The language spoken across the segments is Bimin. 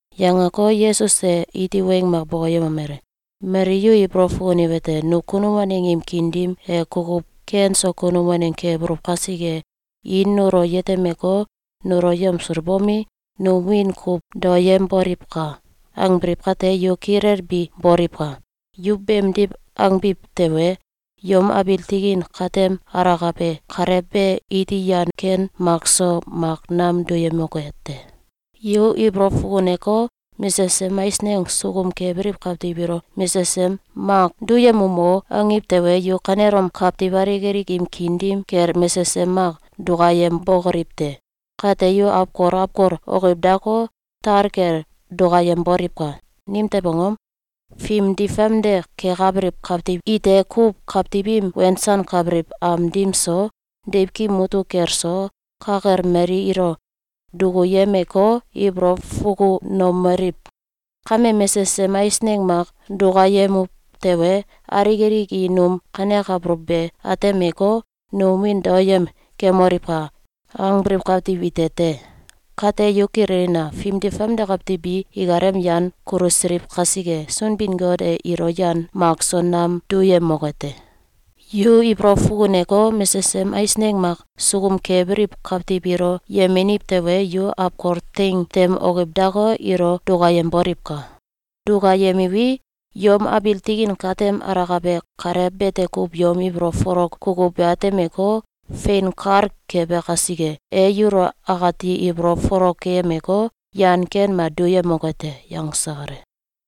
Yangeko, Yesus e iti weng mak bokoyemomele: “Mali yu ibolow fukuniwete: ‘Nu kunum waneng im kiin dim e kukuw ken so kunum waneng kebuluw kasike, i nulo yetemeko, nulo yamsulbomi, num wiin kuw daoyemboliwka!’, angbiliw kate, yu kilelbi boliwka! Yu beemdiw angbiw tewe, yom abiil tikin katem alakabe Kalew be iti yan ken makso mak nam duyemoke te. Yu ibolow fukuneko, mesesem eisneng sukum kebiliw kawtiw ilo ‘Mesesem mak duyemum o!’, angiw tewe, yu kanelom kawtiw alik alik im kiin dim kel mesesem mak dukayembokoliw te! Kate, yu awkol awkol okiw dako, tal kel dukayemboliwka! Nimtew angom? Fimdi famde kekabiliw kawtiw ite kuw kawtiw im wensankabiliw am dim so, deiwkim mutuk kel so, ka kel mali ilo dukuyemeko, ibolow fukunomeliw: ‘Kame mesesem eisneng mak dukayemuw tewe, alik alik i num kanekabuluw be atemeko, num wiin daoyem kemoliwka!’, angbiliw kawtiw ite te. Kate, yu kililina! Fimdi famde kawtiw bi ikalem yan kulusiliw kasike, Sunbin-Got e ilo yan mak so nam duyemoke te. Yu ibolow fukuneko, mesesem eisneng mak sukum kebiliw kawtiw ilo yemeniw tewe, yu awkol teing tem okiw dako, ilo dukayemboliwka! Dukayemiwi, yom abiil tikin katem alakabe Kalew bete kuw yom ibolow folok kukuw be atemeko, fein kal kebe kasike, e yulo akati ibolow folok keyemeko, yan ken mak duyemoke te.”, yangse kale.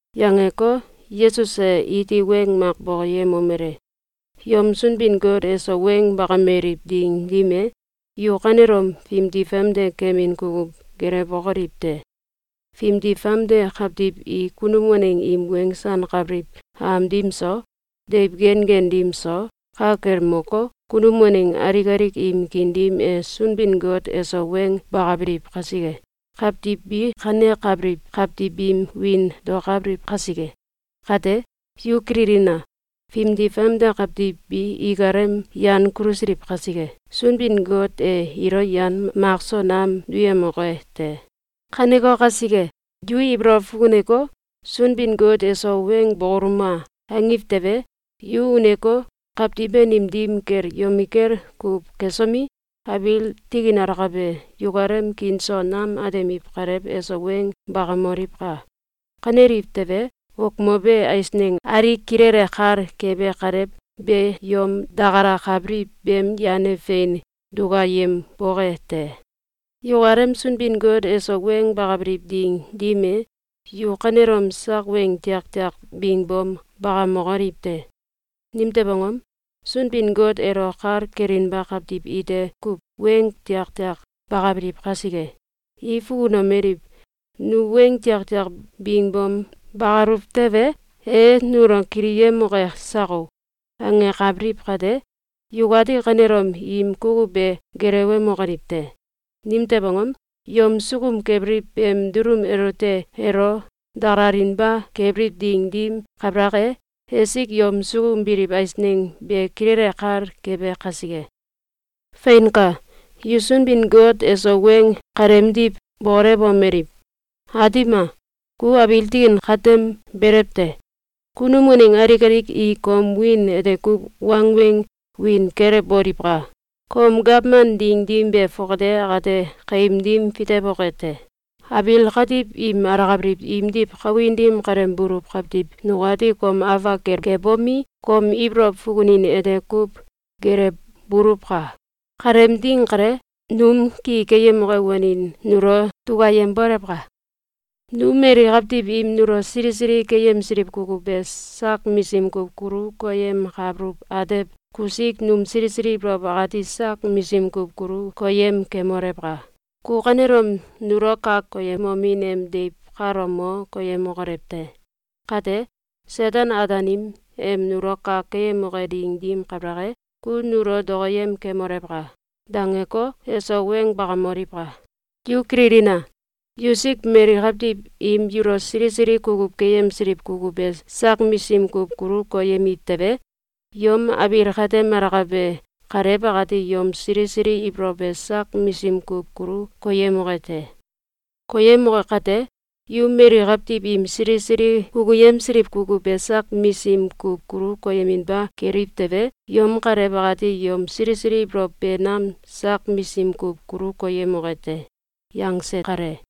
Yangeko, Yesus e iti weng mak bokoyemomele: “Yom Sunbin-Got eso weng bakameliw ding dim e, yu kanelom fimdi famde kemin kukuw gelewbokoliw te! Fimdi famde kawtiw i kunum waneng im wensankabiliw am dim so, deiw gen gen dim so, ka kel moko, kunum waneng alik alik im kiin dim e Sunbin-Got eso weng bakabiliw kaiske, kawtiw bi kanekabiliw kawtiw biim wiin daokabiliw kasike. Kate, yu kililina! Fimdi famde kawtiw bi ikalem yan kulusiliw kasike, Sunbin-Got e ilo yan mak so nam duyemoke te. Kaneko kasike, yu ibolow fukuneko, ‘Sunbin-Got eso weng bokoluma!’, angiw tewe, yu uneko, kawtiw banim dim kel yomikel kuw kesomi, abiil tikin alakabe yukalem kiin so nam atemiw Kalew eso weng bakamoliwka! Kaneliw tewe, okmobe eisneng alik kilele kal kebe Kalew be yom dakalakabiliw beem yan e fein dukayemboke te. Yukalem Sunbin-Got eso weng bakabiliw ding dim e, yu kanelom sak weng tiaktiak bingbom bakamokoliw te! Nimtew angom? Sunbin-Got elo kal kelinba kawtiw ite kuw weng tiaktiak bakabiliw kasike. I fukunomeliw: ‘Nu weng tiaktiak bingom bakaluw tewe, e nulo kiliyemoke sako!’, angenkabiliw kate, yukati kanelom im kukuw be gelewemokoliw te! Nimtew angom? Yom sukum kebiliw beem dulum elote elo dakalalinba kebiliw ding dim kabalak e, esik yom sukum biliw eisneng be kilele kal kebe kasike. Feinka! Yu Sunbin-Got eso weng kaleemdiw bokolewomeliw: ‘Aatim a! Ku abiil tikin katem belew te. Kunum waneng alik alik i kom wiin ete kuw wangweng wiin kelewboliwka! Kom gawman ding dim be fongate akate kaim dim fitewoke te! Abiil katiw im alakabiliw imdiw kawin dim kale buluw kawtiw nukati kom afak kel kebomi, kom ibolow fukunin ete kuw gelewbuluwka! Kaleem ding kale, num ki keyemoke wanin nulo dukayembolewka! Num mali kawtiw im nulo sili sili keyemsiliw kukuw be sak misim kuw kulu koyemkabuluw atew kusik num sili sili ibolow akati sak misim kuw kulu koyem kemolewka! Ku kanelom nulo kak koyemomin em deiw kalo mo koyemokolew te! Kate, Seten-Ataanim em nulo kak keyemoke ding dim kabalak e, ku nulo dokoyem kemolewka!’, dangeko, eso weng bakamoliwka! Yu kililina! Yusik mali kawtiw im yulo sili sili kukuw keyemsiliw kukuw be sak misim kuw kulu koyemiw tewe, yom abiil katem alakabe Kalew akati yom sili sili ibolow be sak misim kuw kulu koyemoke te. Koyemoke kate, yu mali kawtiw im sili sili kukuyemsiliw kukuw be sak misim kuw kulu koyeminba keliw tewe, yom Kalew akati yom sili sili ibolow be nam sak misim kuw kulu koyemoke te.”, yangse kale.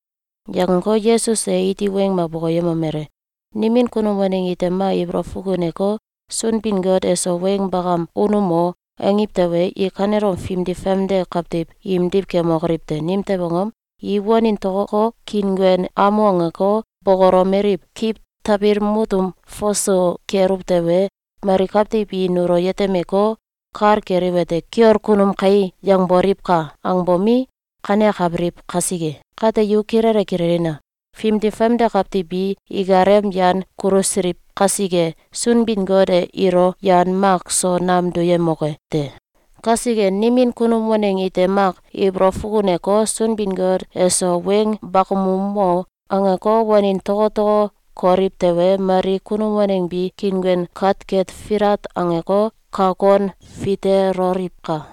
Yangeko, Yesus e iti weng mak bokoyemomele: “Nimin kunum waneng ite mak ibolow fukuneko, ‘Sunbin-Got eso weng bakam unumo!’, angiw tewe, i kanelom fimdi famde kawtiw imdiw kemokoliw te! Nimtew angom? I wanin tokoko, kiinguen amu angeko, bokolomeliw: ‘Kiw tabil mutum fasu keluw tewe, mali kawtiw i nulo yetemeko, kal keliwete: ‘Kiol kunum kai!’, yangboliwka!’, angbomi, kanekabiliw kasike. Kate yu kilele kililina! Fimdi famde kawtiw bi ikalem yan kulusiliw kasike, Sunbin-Got e ilo yan mak so nam duyemoke te. Kasike, nimin kunum waneng ite mak ibolow fukuneko, ‘Sunbin-Got eso Weng bakamumo!’, angeko, wanin tokoko, koliw tewe, mali kunum waneng bi kiinguen katket filat angeko, kak kon fiteloliwka!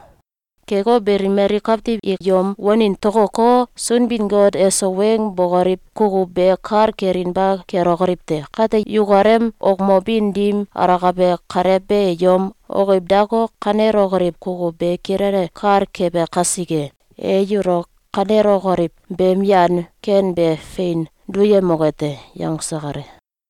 Keko beli, mali kawtiw i yom wanin tokoko, Sunbin-Got eso weng bokoliw kukuw be kal kelinba kelokoliw te. Kate, yukalem okmobin dim alakabe Kalew be yom okiw dako, kanelokoliw kukuw be kilele kal kebe kasike, e yulo kanelokoliw beem yan ken be fein duyemoke te.”, yangse kale.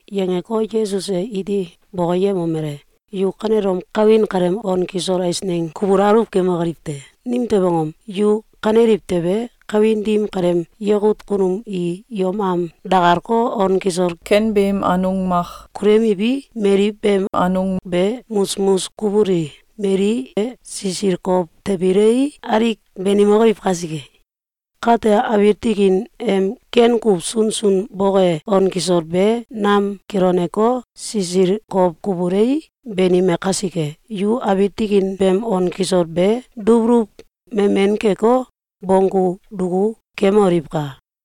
Yangeko, Yesus e iti bokoyemomele: “Yu kanelom kawin kaleem on kisol eisneng kubul aluw kemokoliw te! Nimtew angom? Yu kaneliw tewe, kawin dim kaleem yakut kunum i yom am dakalko, on kisol ken beem anung mak kuluyemiwi, mali beem anung be musmus kubuli, mali e sisil kow tabilei, alik banimokoliw kasike. Kate abiil tikin em ken kuw sunsun boke on kisol be nam kiloneko, sisil kow kubulei, banime kasike, yu abiil tikin beem on kisol be dubuluw memen keko, bonggu duku kemoliwka!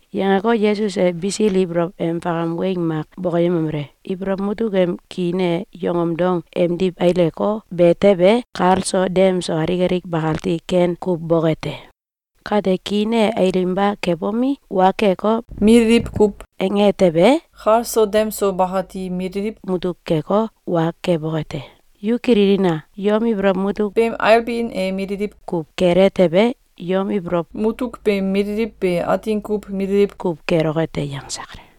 Yangeko, Yesus e bisil ibolow em fakam weng mak bokoyemomele: “Ibolow mutuk em kiin e yongom dong emdiw aileko, be tewe, kal so dem so alik alik bakati ken kuw boke te. Kate, kiin e ailinba kebomi, wa keko, mililiw kuw ange tewe, kal so dem so bakati mililiw mutuk keko, wa keboke te. Yu kililina! Yom ibolow mutuk beem ailbin e mililiw kuw kele tewe, yom ibolow mutuk beem mililiw be atin kuw mililiw kuw keloke te.”, yangse kale.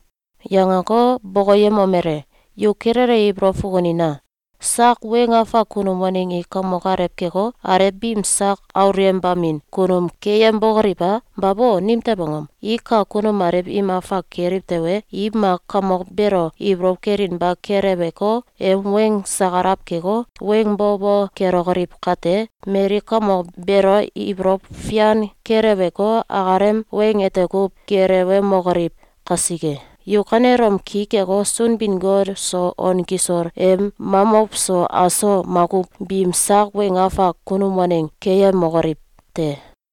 Yangeko, bokoyemomele: “Yu kilele ibolow fukunina! Sak weng afak kunum waneng i kamok alew keko, alew biim sak aulyembamin kunum keyembokoliw a? Babo! Nimtew angom? I kak kunum alew im afak keliw tewe, i mak kamok beelo ibolow kelinba keleweko, em weng sakalaw keko, weng bo bo kelokoliw kate, mali kamok beelo ibolow fian keleweko, akalem weng ete kuw gelewemokoliw kasike. Yu kanelom ki keko, Sunbin-Got so on kisol em mamow so aso makuw biim sak weng afak kunum waneng keyemokoliw te!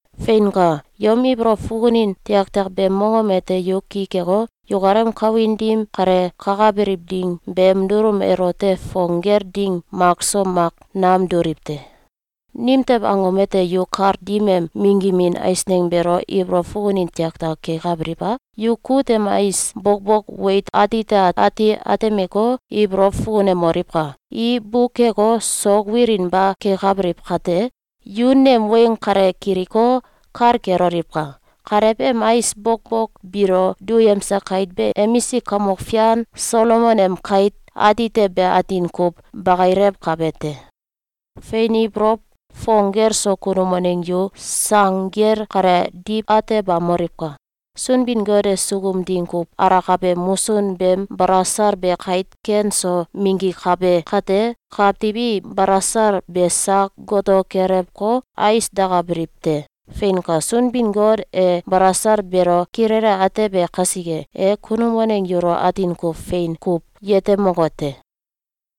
Feinka! Yom ibolow fukunin tiaktiak beem mongom ete yu ki keko, yukalem kawin dim kale kakabiliw ding beem dulum elote fong gel ding makso mak nam duliw te. Nimtew angom ete yu kal dim em minggimin eisneng beelo ibolow fukunin tiaktiak kekabiliw a? Yu kut em ais bokbok weit atite ati atemeko, ibolow fukunemoliwka! I bukeko, sok wilinba kekabiliw kate, yu nem weng kale kiliko, kal keloliwka! Kalew em ais bokbok biilo duyemse kait be emisk kamok fian Solomon em kait atite be atin kuw bakilewkabe te. Fein ibolow fong gel so kunum waneng yu sang gel kale diw atebamoliwka! Sunbin-Got e sukum ding kuw alakabe musun beem balasal be kait ken so minggikabe kate, kawtiw i balasal be sak goto kelewko, ais dakabiliw te. Feinka! Sunbin-Got e balasal beelo kilele atebe kasike, e kunum waneng yulo atin kuw fein kuw yetemoke te!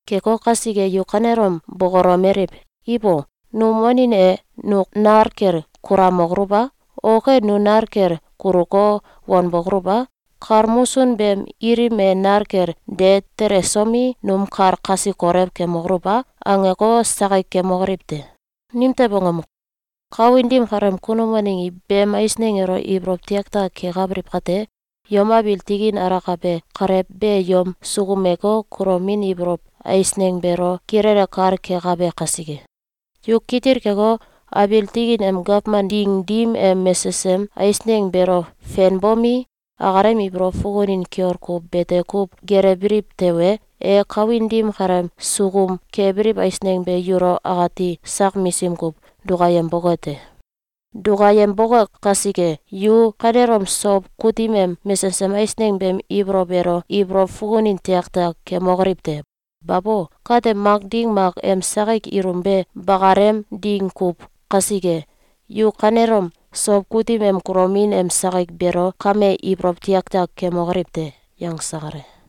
Keko kasike, yu kanelom bokolomeliw: ‘Ibo! Num wanin e nu nal kel kulamokoluw a? Ok e, nu nal kel kuluko, wanbokoluw a? Kal musun beem ilim e nal kel de telesomi, num kal kasi kolew kemokoluw a?’, angeko, sakik kemokoliw te! Nimtew angom? Kawin dim kaleem kunum waneng i beem eisneng elo ibolow tiaktiak kekabiliw kate, yom abiil tikin alakabe Kalew be yom sukumeko, kulomin ibolow eisneng beelo kilele kal kekabe kasike. Yu kitil keko, abiil tikin em gawman ding dim em mesesem eisneng beelo fenbomi, akalem ibolow fukunin kiol kuw bete kuw gelewbiliw tewe, e kawin dim kaleem sukum kebiliw eisneng be yulo akati sak misim kuw dukayemboke te. Dukayemboke kasike, yu kanelom sow kutim em mesesem eisneng beem ibolow elo ibolow fukunin tiaktiak kemokoliw te! Babo! Kate mak ding mak em sakik ilum be bakalem ding kuw kasike, yu kanelom sow kutim em kulomin em sakik beelo kame ibolow tiaktiak kemokoliw te!”, yangse kale.